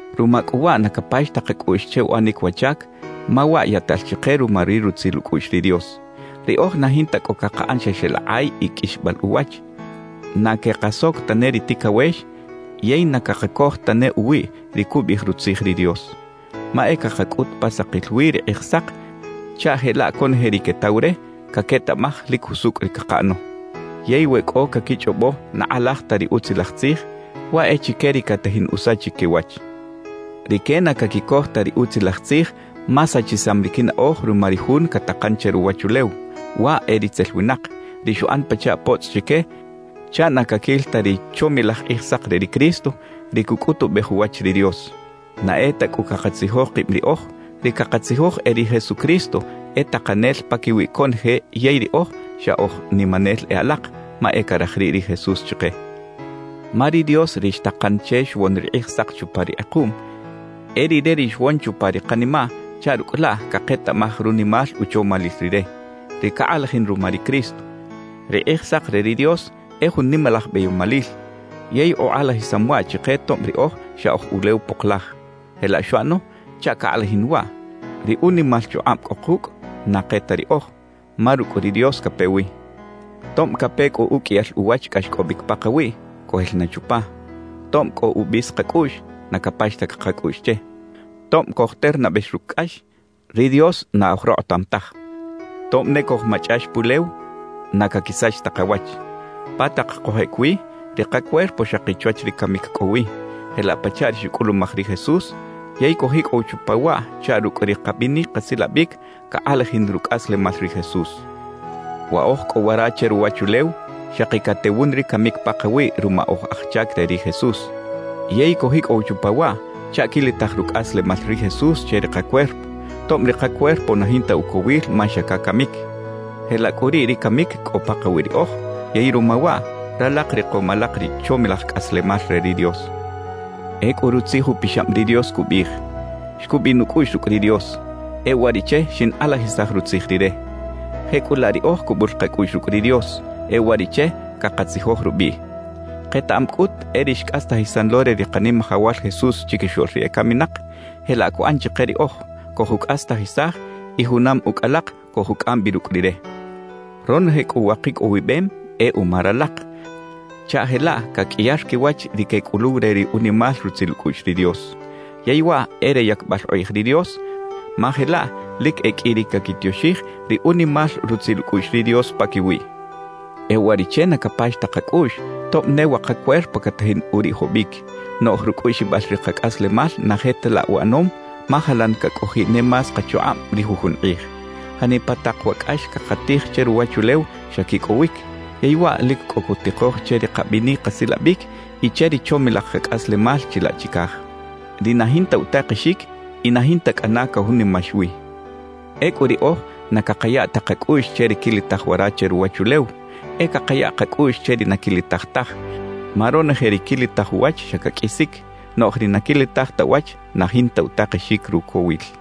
Ruma cꞌu waꞌ na capax ta kacꞌuꞌx che uꞌanic wa chac, ma waꞌ yaꞌtal chike ruma ri rutzil ucꞌuꞌx ri Dios. Riꞌoj na jinta cꞌo cakaꞌan xa xeꞌlakꞌay y qꞌuixbal uwach, na quekasoc tane ri ticawex yey na cakacoj tane uwiꞌ ri cubiꞌij Rutzij ri Dios. Ma e cakacꞌut pa sakil wi ri Kꞌijsak chaꞌ jelaꞌ conoje ri quetaw re, caquetaꞌmaj lic jusucꞌ ri cakaꞌano. Yey we cꞌo caquichꞌobo na kꞌalaj ta ri Utzilaj Tzij, waꞌ e chique ri catajin usachic quiwach. Rique na caquicoj ta ri Utzilaj Tzij ma sachisam ri quinaꞌoj ruma ri jun catakan che ruwachulew; waꞌ e ritzel winak, ri xuꞌan pachaꞌ potzꞌ chique chaꞌ na caquil ta ri chomilaj Kꞌijsak re ri Cristo, ri cucꞌutubej uwach ri Dios. Na e ta cꞌu cakatzijoj kib riꞌoj; ri cakatzijoj e ri Jesucristo e Takanel paquiwi conoje yey riꞌoj xa oj nimanel e alak, ma e caraj riꞌ ri Jesús chike. Ma ri Dios ri xtakan che xwon ri kꞌijsak chupa ri kꞌekuꞌm, e Rire ri xwon chupa ri kanimaꞌ chaꞌ rucꞌ laꞌ caketaꞌmaj runimal uchomalil Rire, ri cakꞌalajin ruma ri Cristo. Ri Kꞌijsak re ri Dios e jun nimalaj beyomalil, yey ukꞌalajisam waꞌ chike tob riꞌoj xa oj ulew poklaj. Jelaꞌ xuꞌano chaꞌ cakꞌalajin waꞌ: Ri unimal chukꞌab cꞌo kucꞌ, na ke ta riꞌoj, ma rucꞌ ri Dios cape wi. Tob cape cꞌu uqꞌuiyal uwach cꞌaxcꞌobic pakawiꞌ, cojel na chupa. Tob cꞌo ubis kacꞌuꞌx, na capax ta kacꞌuꞌx che. Tob cojternabex rucꞌ cꞌax, ri Dios na oj rokꞌotam taj. Tob ne cojmachꞌax pulew, na caquisach ta kawach. Pa tak cojꞌec wi, ri kacuerpo xaki chwach ri camic cꞌo wi, jelaꞌ pachaꞌ ri xucꞌulumaj ri Jesús; yey cojicꞌow chupa waꞌ chaꞌ rucꞌ ri kabinic kasilabic cakꞌalajin rucꞌaslemal ri Jesús. Wa oj cꞌo wara che ruwachulew, xaki catewun ri camic pakawiꞌ ruma oj aj chac re ri Jesús; yey cojicꞌow chupa waꞌ chaꞌ quilitaj rucꞌaslemal ri Jesús che ri kacuerpo, tob ri kacuerpo na jinta ucowil ma xa cacamic. Jelaꞌ cꞌu riꞌ ri camic cꞌo pakawiꞌ riꞌoj; yey ruma waꞌ, ralak rikom alak ri chomilaj cꞌaslemal re ri Dios. Ecꞌu Rutzij Upixab ri Dios cubiꞌij: Xcubiꞌ nucꞌuꞌx rucꞌ ri Dios, e uwariꞌche xinkꞌalajisaj Rutzij Rire. Jecꞌulaꞌ riꞌoj cubul kacꞌuꞌx rucꞌ ri Dios; e uwariꞌche cakatzijoj rubiꞌ. Ketaꞌam cꞌut e ri xcꞌastajisan lo re ri Kanimajawal Jesús chiquixoꞌl ri ecaminak, jelaꞌ cuꞌan chike riꞌoj; cojucꞌastajisaj y junam ucꞌ alak cojucꞌam bi rucꞌ Rire. Ronoje cꞌu wa kicꞌowibem e uma ralak, chaꞌ jelaꞌ caqꞌuiyar quiwach ri quecꞌuluw re ri unimal rutzil ucꞌuꞌx ri Dios. Yey waꞌ e re yacbal ukꞌij ri Dios, ma jelaꞌ lic e qꞌui ri caquitioxij ri unimal rutzil ucꞌuꞌx ri Dios paquiwiꞌ. E uwariꞌche na capax ta kacꞌuꞌx, tob ne wa kacuerpo catajin uriꞌjobic; noꞌj rucꞌuꞌxibal ri kacꞌaslemal na je ta laꞌ uꞌanom, ma jalan cacꞌojiꞌ ne más kachukꞌab ri jujun kꞌij. Janipa tak wa cꞌax cakatij che ruwachulew xa quicꞌowic, yey waꞌ lic cꞌo cutikoj che ri kabinic kasilabic y che ri chomilaj kacꞌaslemal chilaꞌ chicaj, ri na jinta utakexic y na jinta cꞌana cajunimax wi. Ecꞌu riꞌoj na cakaya ta kacꞌuꞌx che ri quilitaj wara che ruwachulew, e cakaya kacꞌuꞌx che ri na quilitaj taj; ma ronoje ri quilitaj uwach xa caqꞌuisic, noꞌj ri na quilitaj ta uwach na jinta utakexic rucowil.